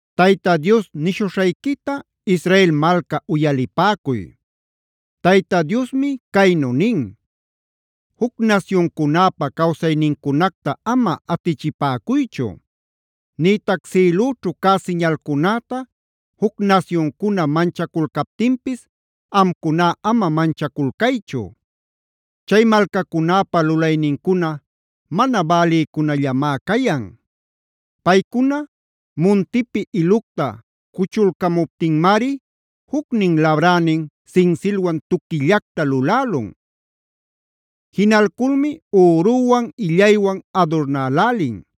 Tayta Dios nishuśhayquita Israel malca uyalipäcuy. Tayta Diosmi caynu nin: “Juc nasyuncunäpa cawsaynincunacta ama atichipäcuychu; nïtac sïlüćhu cä siñalcunäta juc nasyuncuna manchaculcaptinpis amcuná ama manchaculcaychu. Chay malcacunäpa lulaynincuna mana bälïcunallamá cayan. Paycuna muntipi ilucta cuchulcamuptinmari jucnin labränin sinsilwan tuquillacta lulälun. Jinalculmi üruwan, illaywan adurnälälin.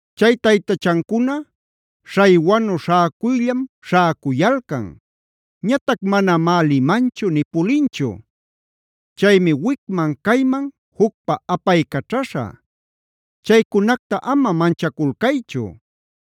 Chay taytachancuna śhaywanü śhäcuyllam śhäcuyalcan. Ñatac manamá limanchu nï pulinchu.b Chaymi wicman-cayman jucpa apaycaćhaśha. Chaycunacta ama manchaculcaychu;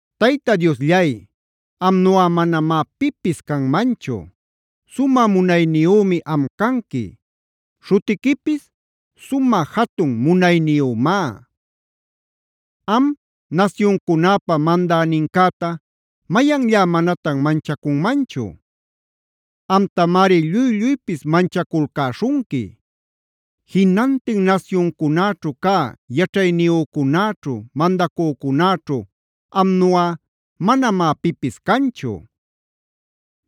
Tayta Diosllay, amnuꞌa manamá pipis canmanchu. Sumä munayniyümi am canqui; śhutiquipis Sumä Jatun Munayniyümá. Am, nasyuncunäpa mandänincäta, ¿mayanllá manatan manchacunmanchu?d Amtamari lluy-lluypis manchaculcäśhunqui. Jinantin nasyuncunäćhu cä yaćhayniyücunäćhu, mandacücunäćhu amnuꞌa manamá pipis canchu.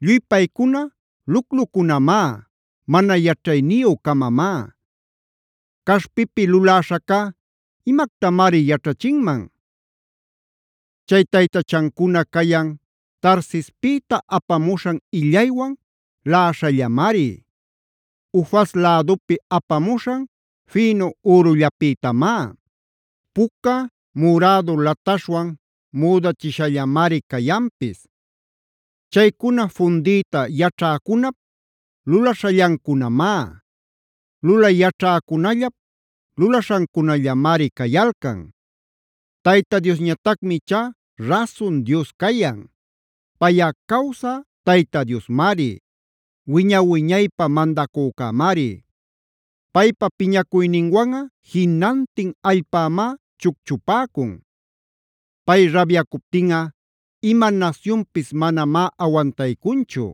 Lluy paycuna luclucunamá; mana yaćhayniyü-camamá. Caśhpipi luläśhacá, ¿imactamari yaćhachinman? Chay taytachancuna cayan Tarsispïta apamuśhan illaywan laꞌaśhallamari; Ufaz lädupi apamuśhan fïnu ürullapïtamá. Puca, murädu lataśhwan müdächishallamari cayanpis. Chaycuna fundiyta yaćhäcunap lulaśhallancunamá; lulay yaćhäcunallap lulaśhancunallamari cayalcan. Tayta Diosñatacmi ichá rasun Dios cayan. Payꞌa cawsä Tayta Diosmari; wiña-wiñaypä mandacücämari. Paypa piñacuyninwanꞌa jinantin allpämá chucchupäcun; pay rabyacuptinꞌa ima nasyunpis manamá awantaycunchu.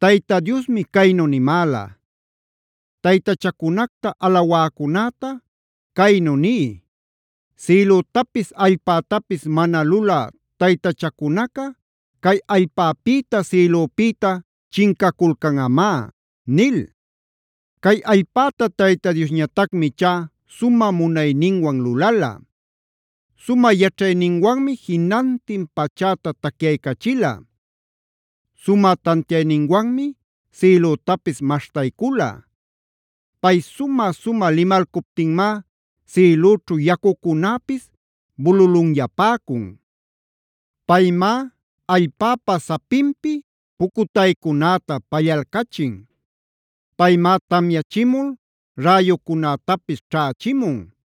Tayta Diosmi caynu nimäla: “Taytachacunacta alawäcunäta caynu niy: ‘Sïlütapis allpätapis mana lulä taytachacunaca cay allpäpïta sïlüpïta chincaculcanꞌamá’” nil. Cay allpäta Tayta Diosñatacmi ichá sumä munayninwan lulala; sumä yaćhayninwanmi jinantin pachäta tacyaycachila. Sumä tantiayninwanmi sïlütapis maśhtaycula. Pay sumä-sumä limalcuptinmá sïlüćhu yacucunäpis bululunyapäcun; paymá allpäpa sapinpi pucutaycunäta pallalcachin; paymá tamyachimul räyucunätapis ćhächimun;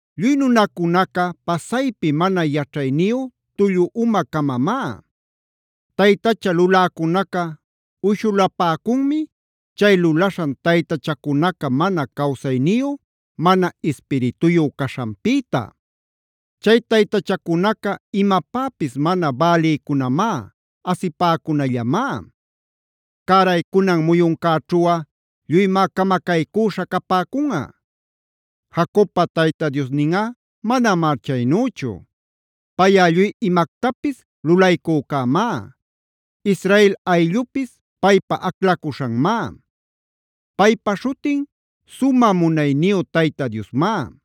Lluy nunacunaca pasaypi mana yaćhayniyu, tullu uma-camamá. Taytacha luläcunaca uyshulapäcunmi chay lulaśhan taytachacunaca mana cawsayniyu, mana ispirituyu caśhanpïta. Chay taytachacunaca imapäpis mana bälïcunamá, asipäcunallamá. Cäraycunan muyuncäćhuꞌa lluymá camacaycüśha capäcunꞌa. Jacobpa Tayta Diosninꞌa manamá chaynüchu. Payꞌa lluy imactapis lulaycücämá. Israel ayllupis paypa aclacuśhanmá; paypa śhutin Sumä Munayniyu Tayta Diosmá.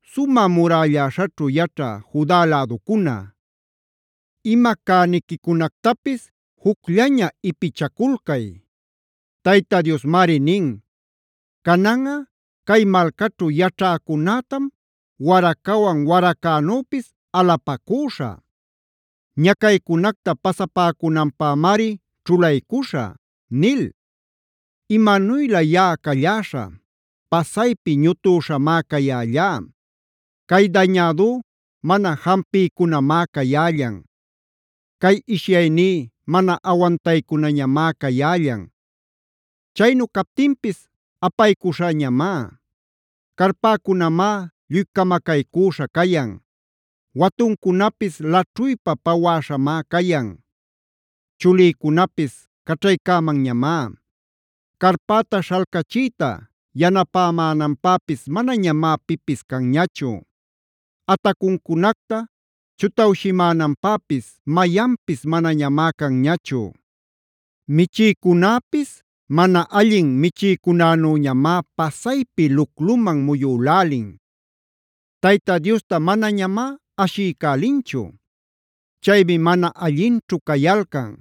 Sumä murälläśhaćhu yaćhä Juda läducuna, ima cäniquicunactapis jucllaña ipichaculcay. Tayta Diosmari nin: “Cananꞌa cay malcaćhu yaćhäcunätam waracawan waracänüpis alapacüśhä. Ñacaycunacta pasapäcunanpämari ćhulaycuśhä” nil. ¡Imanuylä yaꞌa calläśhä! ¡Pasaypi ñutüśhamá cayällá! Cay dañädú mana jampiycunamá cayällan. Cay ishyayní mana awantaycunañamá cayällan; chaynu captinpis apaycuśhäñamá. Carpäcunamá lluy camacaycüśha cayan; watuncunapis laćhuypa pawäśhamá cayan. Chulïcunapis caćhaycämanñamá; carpäta śhalcachiyta yanapämänanpäpis manañamá pipis canñachu; atacuncunacta chutawshimänanpäpis mayanpis manañamá canñachu. Michïcunäpis mana allin michïcunänüñamá pasaypi lucluman muyülälin. Tayta Diosta manañamá ashiycälinchu. Chaymi mana allinćhu cayalcan;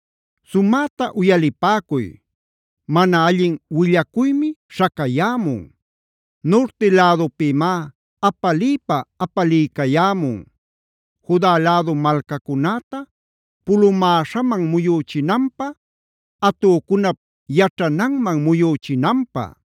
Sumäta uyalipäcuy, mana allin willacuymi śhacayämun; nurti lädupïmá apaliypa apaliycayämun Juda lädu malcacunäta pulumäśhaman muyüchinanpä, atücunap yaćhananman muyüchinanpä.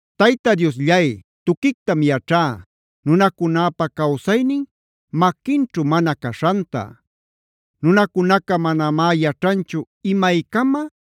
Tayta Diosllay, tuquictam yaćhá nunacunäpä cawsaynin maquinćhu mana caśhanta. Nunacunaca manamá yaćhanchu imaycama,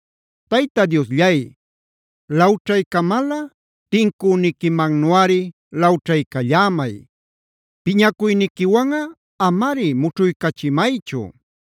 Tayta Diosllay, lawćhaycamalꞌa tincüniquimannuꞌari lawćhaycallämay. Piñacuyniquiwanꞌa amari mućhuycachimaychu;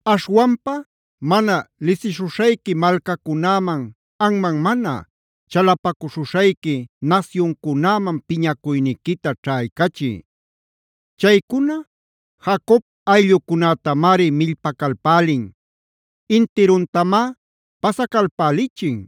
Aśhwanpa mana lisiśhuśhayqui malcacunäman, anman mana chalapacuśhuśhayqui nasyuncunäman piñacuyniquita ćhaycachiy. Chaycuna Jacob ayllucunätamari millpacalpälin; intiruntamá pasacalpälichin;